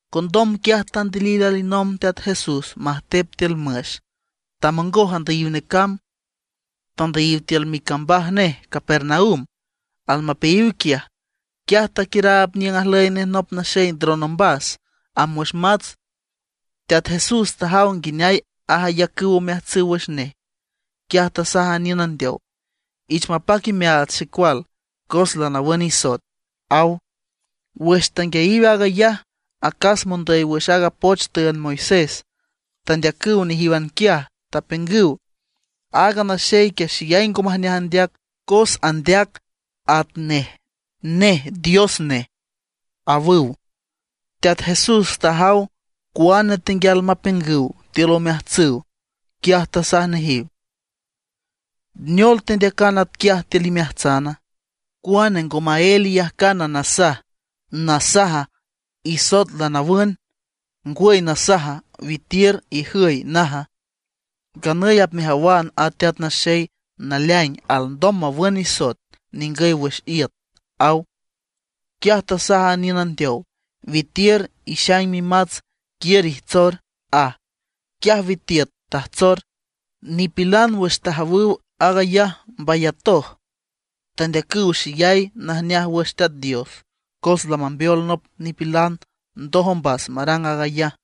Condom quiaj tandilil alinomb Teat Jesús majtep tiül müx, tamongoj andüyiw necamb, tandüyiw tiül micambaj nej Capernaum. Almapeayiw quiaj, quiaj taquiüraab niüng ajlüy nej nop naxey ndron ombas, amb wüx mats. Teat Jesús tajaw nguineay ayacüw omeajtsüw wüx nej, quiaj tasaj a niün andeow: ―Ich mapac imeaats, xecual, cos lanawün isoet ―aw. Wüx tanguiayiw aag ayaj, acas mondüy wüx aaga poch tüünd Moisés tandeacüw nejíwan quiaj, tapiüngüw: “Aaga naxey quiaj xeyay ngo majneaj andeac, cos andeac atnej nej Dios nej”, awüw. Teat Jesús tajaw cuane tenguial mapiüngüw tiül omeajtsüw, quiaj tasaj nejiw: ―¿Neol tendeacan atquiaj tiül imeajtsana? ¿Cuane ngo maél iyajcan nasaj, nasaja: “Isoet lanawün”, ngwüy nasaja: “Witiür, ijüy”, naja? Nganüy apmejawan a Teat Naxey naleaing alndom mawün nisoet ningüy wüx iüt ―aw. Quiaj tasaj a niün andeow: ―Witiür, ixaing mimats, quiür ijtsor ―aj. Quiaj witiüt tajtsor. Nipilan wüx tajawüw aag ayaj mbayatoj. Tandeacüw xeyay najneaj wüx Teat Dios, cos lamambeol nop nipilan ndoj ombas marang aag ayaj.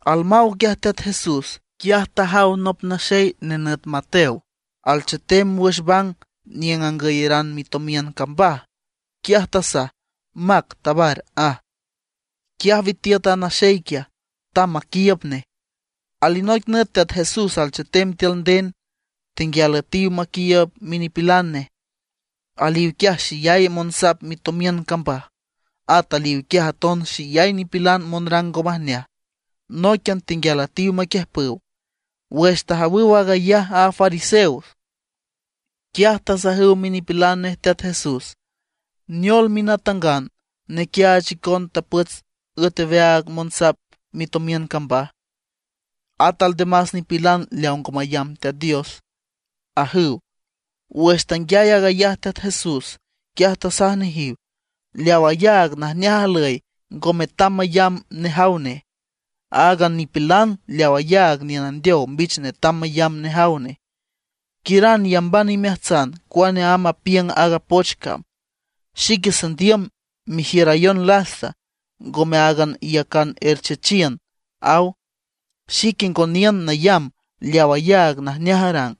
Almaw quiaj Teat Jesús, quiaj tajaw nop naxey nenüt Mateo, alchetem wüx bang niüng angüyeran mitomiün cambaj. Quiaj tasaj: ―Mac tabar ―aj. Quiaj witiüt a naxey quiaj, tamb maquiiüb nej. Alinoic nüt Teat Jesús alchetem tiül nden, tenguial üetiw maquiiüb minipilan nej. Aliw quiaj xeyay monsap mitomiün cambaj; at aliw quiaj aton xeyay nipilan monrang ngo majneaj. Nóiquian tenguial üetiw maquiüjpüw. Wüx tajawüw aag ayaj a fariseos, quiaj tasajüw minipilan nej Teat Jesús: ―¿Neol minatangan nequiaach icon tapots üet aweaag monsap mitomiün cambaj, at aldemás nipilan leaw ngo mayambüw Teat Dios? ―ajüw. Wüx tanguiay aag ayaj Teat Jesús, quiaj tasaj nejiw: ―Leaw ayaag najneaj ajlüy ngo metam mayamb nejaw nej, áagan nipilan leaw ayaag niün andeow mbich netam mayamb nejaw nej. Quiüran iyamban imeajtsan cuane amb apiüng aaga poch cam: “Xique sandiüm merjiürayon lasta, ngome áagan iyacan erchechiün”, aw. Xique ngo niün nayamb leaw ayaag najneaj arang,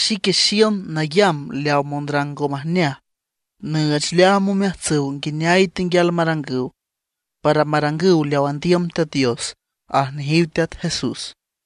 xique xiün nayamb leaw monrang ngo majneaj, nüüch leaam omeajtsüw nguineay tenguial marangüw, para marangüw leaw andiüm Teat Dios ―aj nejiw Teat Jesús.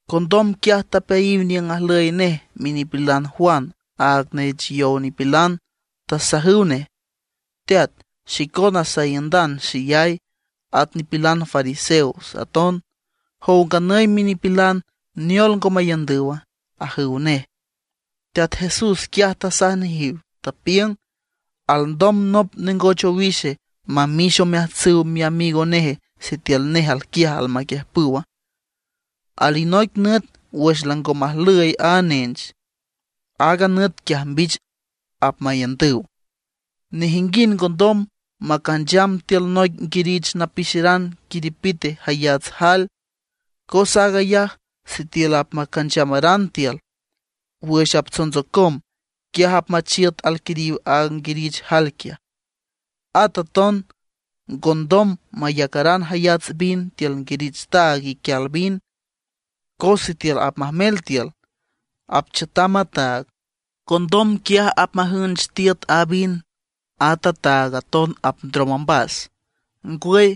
Condom quiaj tapeayiw niüng ajlüy nej minipilan Juan aaga neech yow nipilan, tasajüw nej: ―Teat, xicona saiündan xeyay, at nipilan fariseos aton. Jow nganüy minipilan, ¿neol ngo maiündüwa? ―ajüw nej. Teat Jesús quiaj tasaj nejiw. Tapiüng: ―¿Alndom nop nengoch owixe mamix omeajtsüw miamigo neje sitiül nej alquiaj almaquiüjpüwa? Alinoic nüt wüx lango majlüy a nench, aaga nüt quiaj mbich apmaiündüw. ’Nejinguind ngondom macancham tiül noic nguirich napixeran quiripite jayats jael, cos aag ayaj sitiül apmacanchamaran tiül, wüx aptsontsocom, quiaj apmachiüt alquiriw aaga nguirich jael quiaj. At aton ngondom mayacaran jayats vin tiül nguirich taag iquial vin, cos sitiül apmajmel tiül, apchiütam a taag, condom quiaj apmajünch tiüt a vin, at a taag aton apndrom ombas. Ngwüy,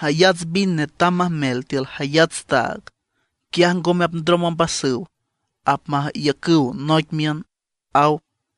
jayats vin netam majmel tiül jayats taag; quiaj ngome apndrom ombasüw, apmaiücüw noic miün ―aw.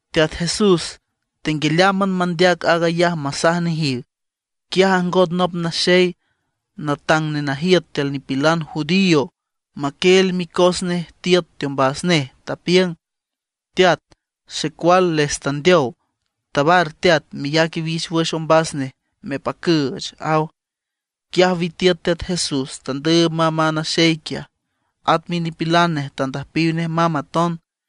Teat Jesús tenguialeámban mandeac aag ayaj masaj nejiw, quiaj ajngot nop naxey, natang nenajiüt tiül nipilan judío, maquieel micos nej tiüt teombas nej, tapiüng: ―Teat, xecual les tandeow. Tabar teat, meyac iwix wüx ombas nej mepacüüch ―aw. Quiaj witiüt Teat Jesús, tandüüb mamb a naxey quiaj, at minipilan nej tandüjpiw nej mamb aton.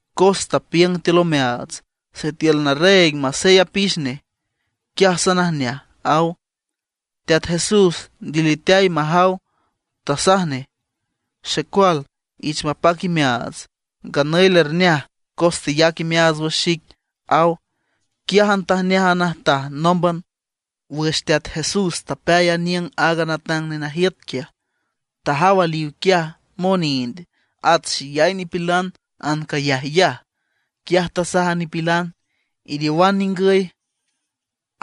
Cos tapiüng tiül omeaats: “Sitiül narreeg masey apix nej, quiaj sanajneaj”, aw. Teat Jesús ndiliteay majaw, tasaj nej: ―Xecual, ich mapac imeaats, nganüy lerneaj cos teyac imeaats wüx xic ―aw. Quiájan tajneaj a najtaj nómban. Wüx Teat Jesús tapeay aniüng aaga natang nenajiüt quiaj, tajaw aliw quiaj monind at xeyay nipilan ancayajyaj. Quiaj tasaj a nipilan: ―Iriowan ningüy,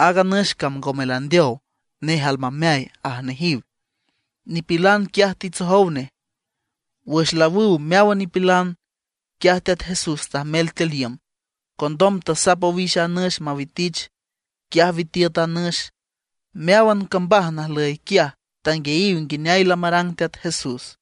aaga nüx cam ngome landeow, nej almameay ―aj nejiw. Nipilan quiaj titsojow nej. Wüx laawüw meáwan nipilan, quiaj Teat Jesús tajmel tiül iüm. Condom tasap owix a nüx mawitich. Quiaj witiüt a nüx. Meáwan cambaj najlüy quiaj tanguiayiw nguineay lamarang Teat Jesús.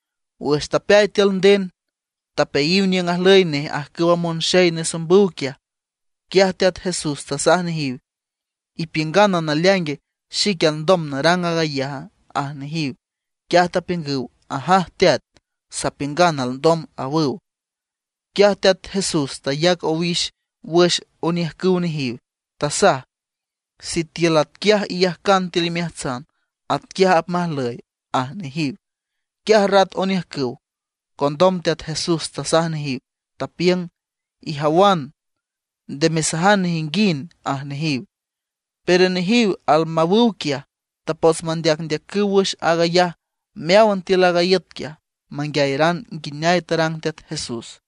Wüx tapeay tiül nden, tapeayiw niüng ajlüy nej ajcüwa monxey nesombüw quiaj. Quiaj Teat Jesús tasaj nejiw: ―¿Ipiüngana naleaing xique alndom narang aag ayaja? ―aj nejiw. Quiaj tapiüngüw: ―Ajaj teat, sapiüngan alndom ―awüw. Quiaj Teat Jesús tayac owix wüx oniüjcüw nejiw, tasaj: ―Sitiül atquiaj iyajcan tiül imeajtsan, atquiaj apmajlüy ―aj nejiw. Quiaj rat oniüjcüw. Condom Teat Jesús tasaj nejiw, tapiüng: ―Ijawan, nde mesajan nejinguind ―aj nejiw. Pero nejiw almawüw quiaj, tapots mandeacndeacüw wüx aag ayaj meáwan tiül aaga iüt quiaj, manguiayeran nguineay tarang Teat Jesús.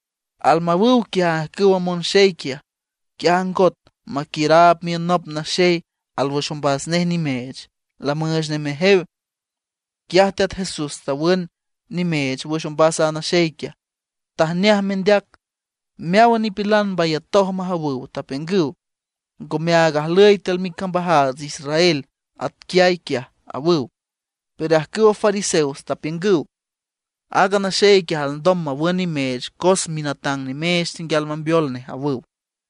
Almawüw quiaj ajcüwa monxey quiaj, quiaj ajngot maquiüraab miün nop naxey alwüx ombas nej nimeech, lamüüch nej mejew. Quiaj Teat Jesús tawün nimeech wüx ombas a naxey quiaj, tajneaj mendeac. Meáwan nipilan mbayatoj majawüw, tapiüngüw: ―Ngomeaag ajlüy tiül micambajaats Israel atquiay quiaj ―awüw. Pero ajcüwa fariseos tapiüngüw: ―Aaga naxey quiaj alndom mawün nimeech cos minatang nimeech tenguial mambeol nej ―awüw.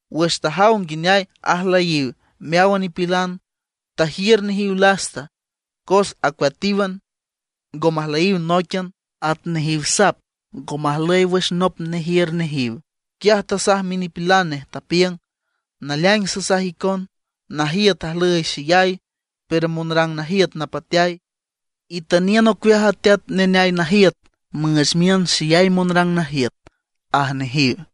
Wüx tajaw nguineay ajlüyiw meáwan nipilan, tajiür nejiw lasta, cos ajcueatíwan, ngo majlüyiw nóiquian, at nejiw sap ngo majlüy wüx nop nejiür nejiw. Quiaj tasaj minipilan nej, tapiüng: ―Naleaing sasaj icon, najiüt ajlüy xeyay, pero monrang najiüt napateay. Itüniün ocueaj a teat neneay najiüt müüch miün xeyay monrang najiüt ―aj nejiw.